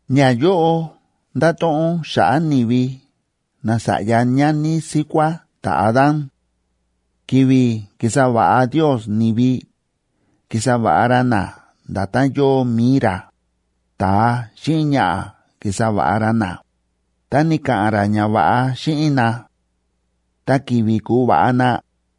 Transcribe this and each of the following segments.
Ñayóꞌo ndáto̱ꞌon xa̱ꞌa̱ ni̱vi nasa̱ꞌya ñani síkuá ta̱Adán. Ki̱vi̱ ki̱sa va̱ꞌa Ndios ni̱vi, ki̱sa va̱ꞌa ra na nda̱tán yóo mi̱i ra. Ta̱a xíꞌin ñaꞌa̱ ki̱sa va̱ꞌa ra na, ta ni̱ka̱ꞌa̱n ra ñava̱ꞌa xíꞌin na. Ta ki̱vi̱ ku̱va̱ꞌa na,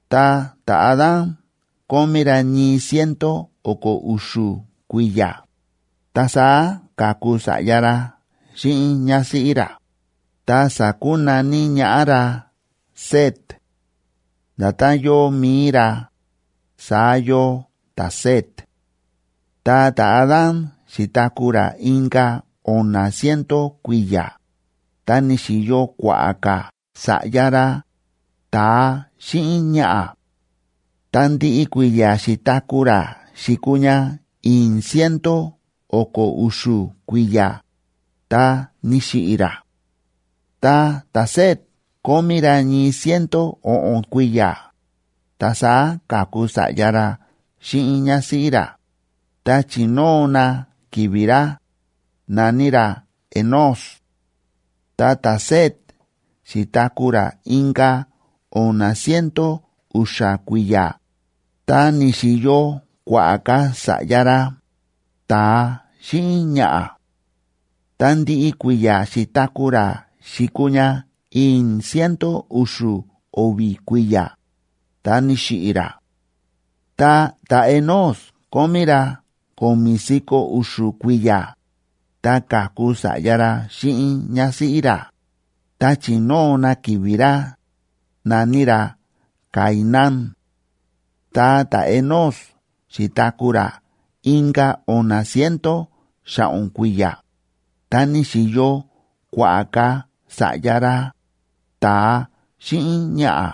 Ta ta̱Adán kómí ra ñii ciento o̱ko̱ u̱xu̱ kui̱ya̱, ta saá ka̱ku sa̱ꞌya ra xíꞌin ñásíꞌí ra, ta sa̱kunaní ñaꞌá ra Set; nda̱tán yóo mi̱i ra, saá yóo ta̱Set. Ta ta̱Adán xi̱taku̱ ra inka̱ o̱na̱ ciento kui̱ya̱, ta ni̱xi̱yo kua̱ꞌa̱ ka̱ sa̱ꞌya ra, ta̱a xíꞌin ñaꞌa̱. Ta ndiꞌi kui̱ya̱ xi̱taku̱ ra xi̱kuu ña i̱i̱n ciento o̱ko̱ u̱xu̱ kui̱ya̱, ta ni̱xiꞌi̱ ra. Ta ta̱Set kómí ra ñii ciento o̱ꞌo̱n kui̱ya̱, ta saá ka̱ku sa̱ꞌya ra xíꞌin ñásíꞌí ra, ta chi̱nóo na ki̱vi̱ ra, na̱ní ra Enós. Ta ta̱Set xi̱taku̱ ra inka̱ o̱na̱ ciento u̱xa̱ kui̱ya̱, ta ni̱xi̱yo kua̱ꞌa̱ ka̱ sa̱ꞌya ra, ta̱a xíꞌin ñaꞌa̱. Ta ndiꞌi kui̱ya̱ xi̱taku̱ ra xi̱kuu ña i̱i̱n ciento u̱xu̱ o̱vi̱ kui̱ya̱, ta ni̱xiꞌi̱ ra. Ta ta̱Enós kómí ra ko̱mi̱ si̱ko̱ u̱xu̱ kui̱ya̱, ta ka̱ku sa̱ꞌya ra xíꞌin ñásíꞌí ra, ta chi̱nóo na ki̱vi̱ ra, na̱ní ra Cainán. Ta ta̱Enós xi̱taku̱ ra inka̱ o̱na̱ ciento xa̱ꞌo̱n kui̱ya̱, ta ni̱xi̱yo kua̱ꞌa̱ ka̱ sa̱ꞌya ra, ta̱a xíꞌin ñaꞌa̱.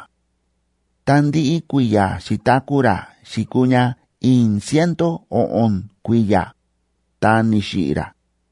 Ta ndiꞌi kui̱ya̱ xi̱taku̱ ra xi̱kuu ña i̱i̱n ciento o̱ꞌo̱n kui̱ya̱, ta ni̱xiꞌi̱ ra.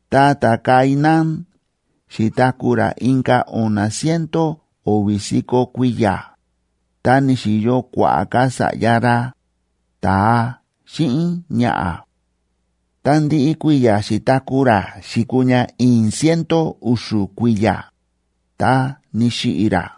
Ta ta̱Cainán xi̱taku̱ ra inka̱ o̱na̱ ciento o̱vi̱ si̱ko̱ kui̱ya̱, ta ni̱xi̱yo kua̱ꞌa̱ ka̱ sa̱ꞌya ra, ta̱a xíꞌin ñaꞌa̱. Ta ndiꞌi kui̱ya̱ xi̱taku̱ ra xi̱kuu ña i̱i̱n ciento u̱xu̱ kui̱ya̱, ta ni̱xiꞌi̱ ra.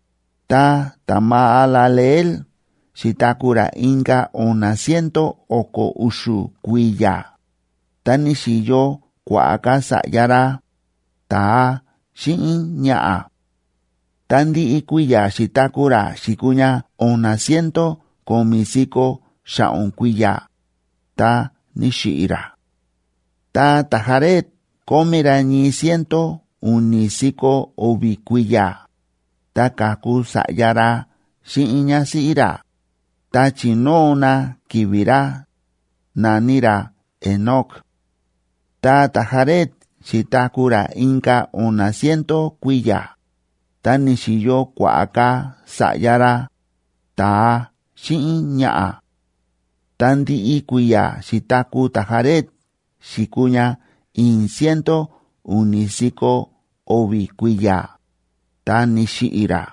Ta ta̱Mahalaleel xi̱taku̱ ra inka̱ o̱na̱ ciento o̱ko̱ u̱xu̱ kui̱ya̱, ta ni̱xi̱yo kua̱ꞌa̱ ka̱ sa̱ꞌya ra, ta̱a xíꞌin ñaꞌa̱. Ta ndiꞌi kui̱ya̱ xi̱taku̱ ra xi̱kuu ña o̱na̱ ciento ko̱mi̱ si̱ko̱ xa̱ꞌo̱n kui̱ya̱, ta ni̱xiꞌi̱ ra. Ta ta̱Jared kómí ra ñii ciento u̱ni̱ si̱ko̱ o̱vi̱ kui̱ya̱, ta ka̱ku sa̱ꞌya ra xíꞌin ñásíꞌí ra, ta chi̱nóo na ki̱vi̱ ra, na̱ní ra Enoc. Ta ta̱Jared xi̱taku̱ ra inka̱ o̱na̱ ciento kui̱ya̱, ta ni̱xi̱yo kua̱ꞌa̱ ka̱ sa̱ꞌya ra, ta̱a xíꞌin ñaꞌa̱. Ta ndiꞌi kui̱ya̱ xi̱taku̱ ta̱Jared xi̱kuu ña i̱i̱n ciento u̱ni̱ si̱ko̱ o̱vi̱ kui̱ya̱, ta ni̱xiꞌi̱ ra.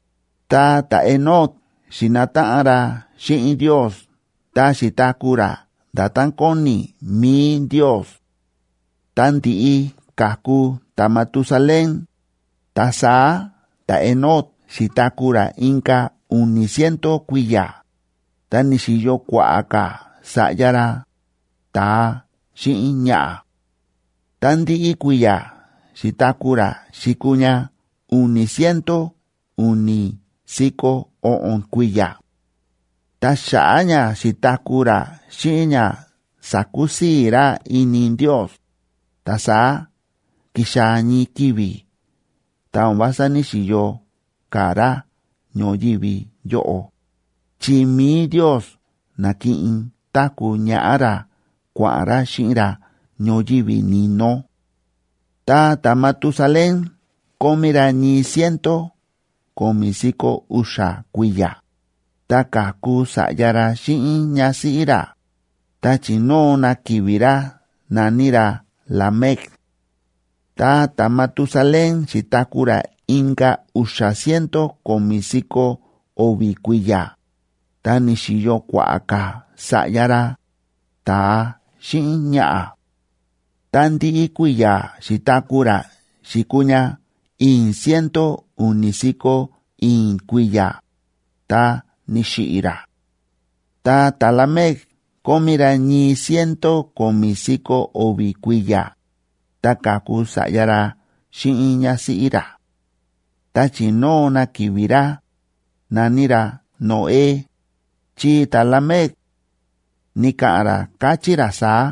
Ta ta̱Enoc xi̱nataꞌan ra xíꞌin Ndios ta xi̱taku̱ ra nda̱tán kóni mi̱i Ndios. Ta ndi̱ꞌi ka̱ku ta̱Matusalén, ta saá ta̱Enoc xi̱taku̱ ra inka̱ u̱ni̱ ciento kui̱ya̱, ta ni̱xi̱yo kua̱ꞌa̱ ka̱ sa̱ꞌya ra, ta̱a xíꞌin ñaꞌa̱. Ta ndiꞌi kui̱ya̱ xi̱taku̱ ra xi̱kuu ña u̱ni̱ ciento u̱ni̱ si̱ko̱ o̱ꞌo̱n kui̱ya̱. Ta xa̱ꞌa̱ ña xi̱taku̱ ra xíꞌin ña sa̱kusii̱ ra ini Ndios, ta saá ki̱xaa̱ ñii ki̱vi̱ ta o̱n vása ní‑xiyo ka̱ ra ñoyívi yóꞌo, chi mi̱i Ndios na̱kiꞌin táku̱ ñaꞌá ra kua̱ꞌa̱n ra xíꞌin ra ñoyívi ni̱no. Ta ta̱Matusalén kómí ra ñii ciento ko̱mi̱ si̱ko̱ u̱xa̱ kui̱ya̱, ta ka̱ku sa̱ꞌya ra xíꞌin ñásíꞌí ra, ta chi̱nóo na ki̱vi̱ ra, na̱ní ra Lamec. Ta ta̱Matusalén xi̱taku̱ ra inka̱ u̱xa̱ ciento ko̱mi̱ si̱ko̱ o̱vi̱ kui̱ya̱, ta ni̱xi̱yo kua̱ꞌa̱ ka̱ sa̱ꞌya ra, ta̱a xíꞌin ñaꞌa̱. Ta ndiꞌi kui̱ya̱ xi̱taku̱ ra xi̱kuu ña i̱i̱n ciento u̱ni̱ si̱ko̱ i̱i̱n kui̱ya̱, ta ni̱xiꞌi̱ ra. Ta ta̱Lamec kómí ra ñii ciento ko̱mi̱ si̱ko̱ o̱vi̱ kui̱ya̱, ta ka̱ku sa̱ꞌya ra xíꞌin ñásíꞌí ra. Ta chi̱nóo na ki̱vi̱ ra, na̱ní ra Noé,b chi ta̱Lamec ni̱ka̱ꞌa̱n ra, káchí ra saá: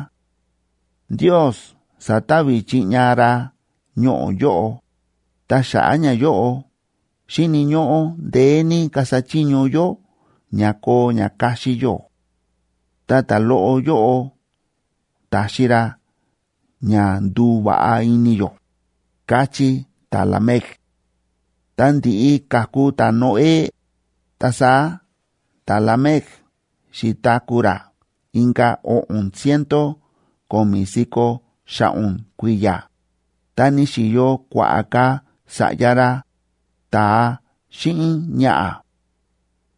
“Ndios sa̱ta̱vi̱ chiꞌña ra ñoꞌo̱ yóꞌo, ta xa̱ꞌa̱ ñayóꞌo xíni̱ ñóꞌó ndeé ní kasa chiño yó ña koo ña kaxi yó. Ta ta̱loꞌo yóꞌo taxi ra ña nduva̱ꞌa ini yó”, káchí ta̱Lamec. Ta ndi̱ꞌi ka̱ku ta̱Noé, ta saá ta̱Lamec xi̱taku̱ ra inka̱ o̱ꞌo̱n ciento ko̱mi̱ si̱ko̱ xa̱ꞌo̱n kui̱ya̱, ta ni̱xi̱yo kua̱ꞌa̱ ka̱ sa̱ꞌya ra, ta̱a xíꞌin ñaꞌa̱.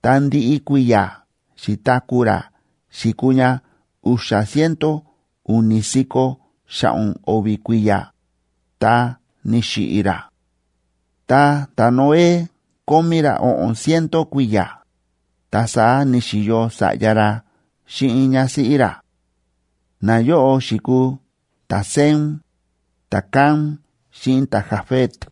Ta ndiꞌi kui̱ya̱ xi̱taku̱ ra xi̱kuu ña u̱xa̱ ciento u̱ni̱ si̱ko̱ xa̱ꞌo̱n o̱vi̱ kui̱ya̱, ta ni̱xiꞌi̱ ra. Ta ta̱Noé kómí ra o̱ꞌo̱n ciento kui̱ya̱, ta saá ni̱xi̱yo sa̱ꞌya ra xíꞌin ñásíꞌí ra; nayóꞌo xi̱kuu ta̱Sem, ta̱Cam xíꞌin ta̱Jafet.